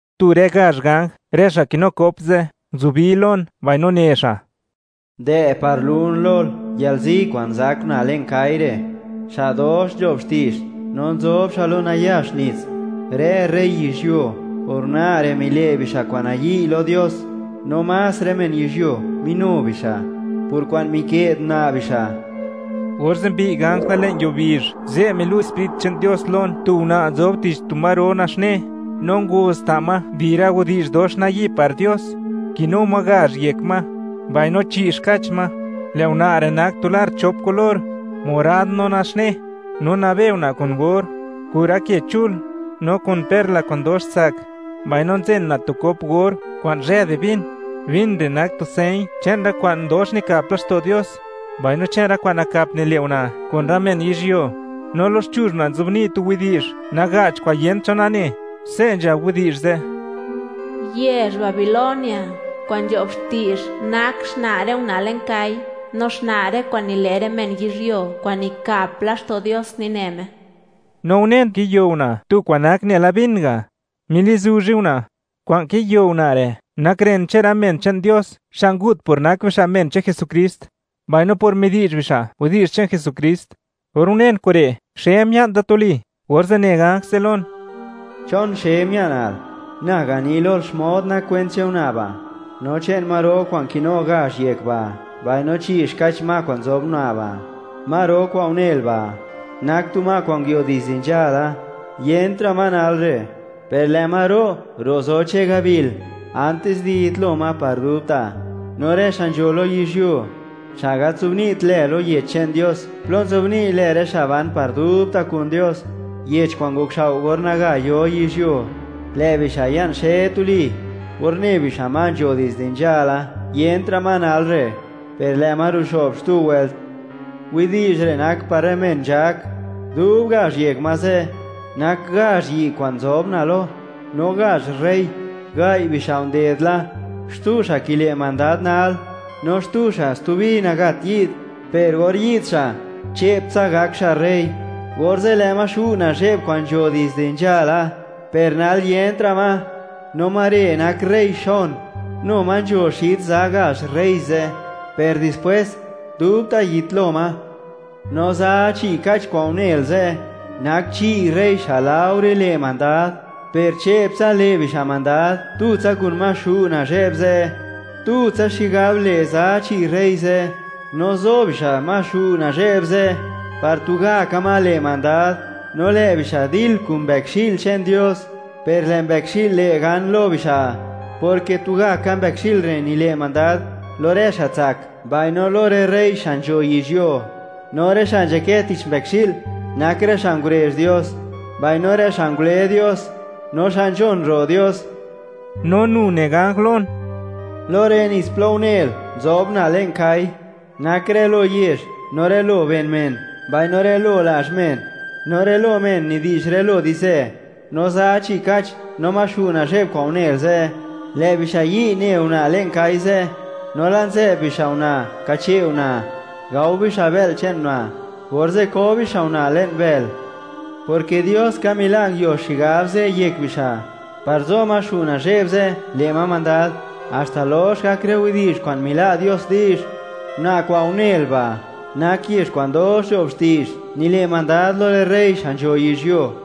Tu rë gazh ganj, rë xa' kinu kop ze', nguzubi lon mbaino ne xa': ―Dë' par lun lol, yalzi kwa'n zak una' le'n kai (kwa' gal) re', xa' dox nzho'b xti'zh, no nzob xa' lo nayax nits. Rë rey yizhyuo, por una' re', mile' bixa' kwa'n nayi' lo Dios, no más rë men yizhyuo minu bixa' por kwa'n mike'd una' bixa'. Orze' mbi'y ganj da le'n yuo bizh, ze' milu' Sprit che'n Dios lon tu una' nzob tich tu ma ro naxne, no ngoz ta' ma di rë widi'zh dox nayi' par Dios; kinu ma gazh yek ma, mbaino chi' xkach ma. Lë' una' re' nak tu lar chop kulor: morad no naxne; no nabe una' kun or, kun rë ke chul, no kun perla kwa'n dox tsak; mbaino nzen una' tu kop or kwa'n zhë di vin; vin re' nak tu señ che'n rë kwa'n dox nikap laxto' Dios, mbaino che'n rë kwa'n nakap nile' una' kun rë men yizhyuo. No loxchuzh una' nzobni' tu widi'zh naga'ch kwa'n yent cho nane, se' nzhab widi'zh ze': “Yezh Babilonia kwa'n nzho'b xti'zh nak xna' rë una' le'n kai (kwa' gal), no xna' rë kwa'n nile' rë men yizhyuo, kwa'n nikap laxto' Dios nine Me.” No unen kiyo una' tu kwa'n nak nela vin ga', milizuzhe una'; kwa'n kiyo una' re' nak ren che'n rë men che'n Dios, xa' ngut por nak bixa' men che'n Jesukrist; mbaino por midi'zh bixa' widi'zh che'n Jesukrist. Or unen kure', xe mia'n da tuli, orze', ne ganj ze' lon: ―¿Chon xe mia'nal? Na gani lol xmod nak kwent che'n una' ba', no che'n ma ro kwa'n kinu gazh yek ba', mbaino chi' xkach ma kwa'n nzob una' ba'. Ma ro kwa'n unel ba', nak tu ma kwa'n nguio dizde nzhala. Yentra' ma nal re', per lë' ma ro', ro' zo che'n gabil antis di yitlo ma par dubta'. No rë xa' nzho lo yizhyuo, xa' gat nzobni't lë lo Yech che'n Dios plo nzobni' lë rë xa' ban par dubta' kun Dios, Yech kwa'n ngokxao' or naga yo yizhyuo; lë' bixa' ya'n xe tuli or ne bixa' ma nzho dizde nzhala; yentra' ma nal re' per lë' ma ruxo'b xtu wëlt. Widi'zh re' nak par rë men nzhak: Dub gazh yek ma ze', nak gazh yi' kwa'n nzob una' lo, no gazh rey: Gai' bixa' nded la, xtu xa' kile' mandad nal, no xtu xa' stubi nagat yi'd, per or yi'd xa', che'ptsa gak xa' rey. Orze' lë' ma nazhe'b kwa'ro ze' kwa'n nzho dizde nzhala, per nal yentra' ma, no ma re' nak rey xon; nu ma nzho xid za gazh rey ze', per dispwes, dubta' yitlo ma. No za chi' kach kwa'n unel ze', nak chi' rey xa' laore le' mandad, per che'ptsa le' bixa' mandad tutsa kun ma nazhe'b kwa'ro ze'. Tutsa xigab le' za chi' rey ze', no zo bixa' ma xu' nazhe'b ze' par tugaka ma le' mandad. No lë' bixa' dil kun Mbëkxi'l che'n Dios, per lë' Mbëkxi'l le' gan lo bixa', porke tugaka Mbëkxi'l re' nile' mandad lo rë xa' tsak, mbaino lo rë rey xa' nzho yizhyuo; no rë xa' nzhakë tich Mbëkxi'l nak rë xa' ngurezh Dios, mbaino rë xa' ngule Dios, no xa' nzhon ro' Dios No nu ne ganj lon: ―Lo rë nits plo unel, nzob una' le'n kai (kwa' gal), nak rë lo yezh, no rë lo ben men, mbaino rë lo lazh men, no rë lo men nidi'zh rë lo di'zhzë. No za chi' kach no ma xu' nazhe'b kwa'n unel ze', lë' bixa' yi' ne una' le'n kai (kwa' gal) ze', no la' nzë'b bixa' una' kache' una'; gao bixa' bë'l che'n una', orze' ko bixa' una' le'n bël, porke Dios ka mila' nguio xigab ze' yek bixa', par zo ma nazhe'b kwa'ro ze', le' ma mandad, haxta lox gak rë widi'zh kwa'n mila' Dios di'zh. Una' kwa'n unel ba', nak yezh kwa'n dox nzho'b xti'zh, nile' mandad lo rë rey xa' nzho yizhyuo.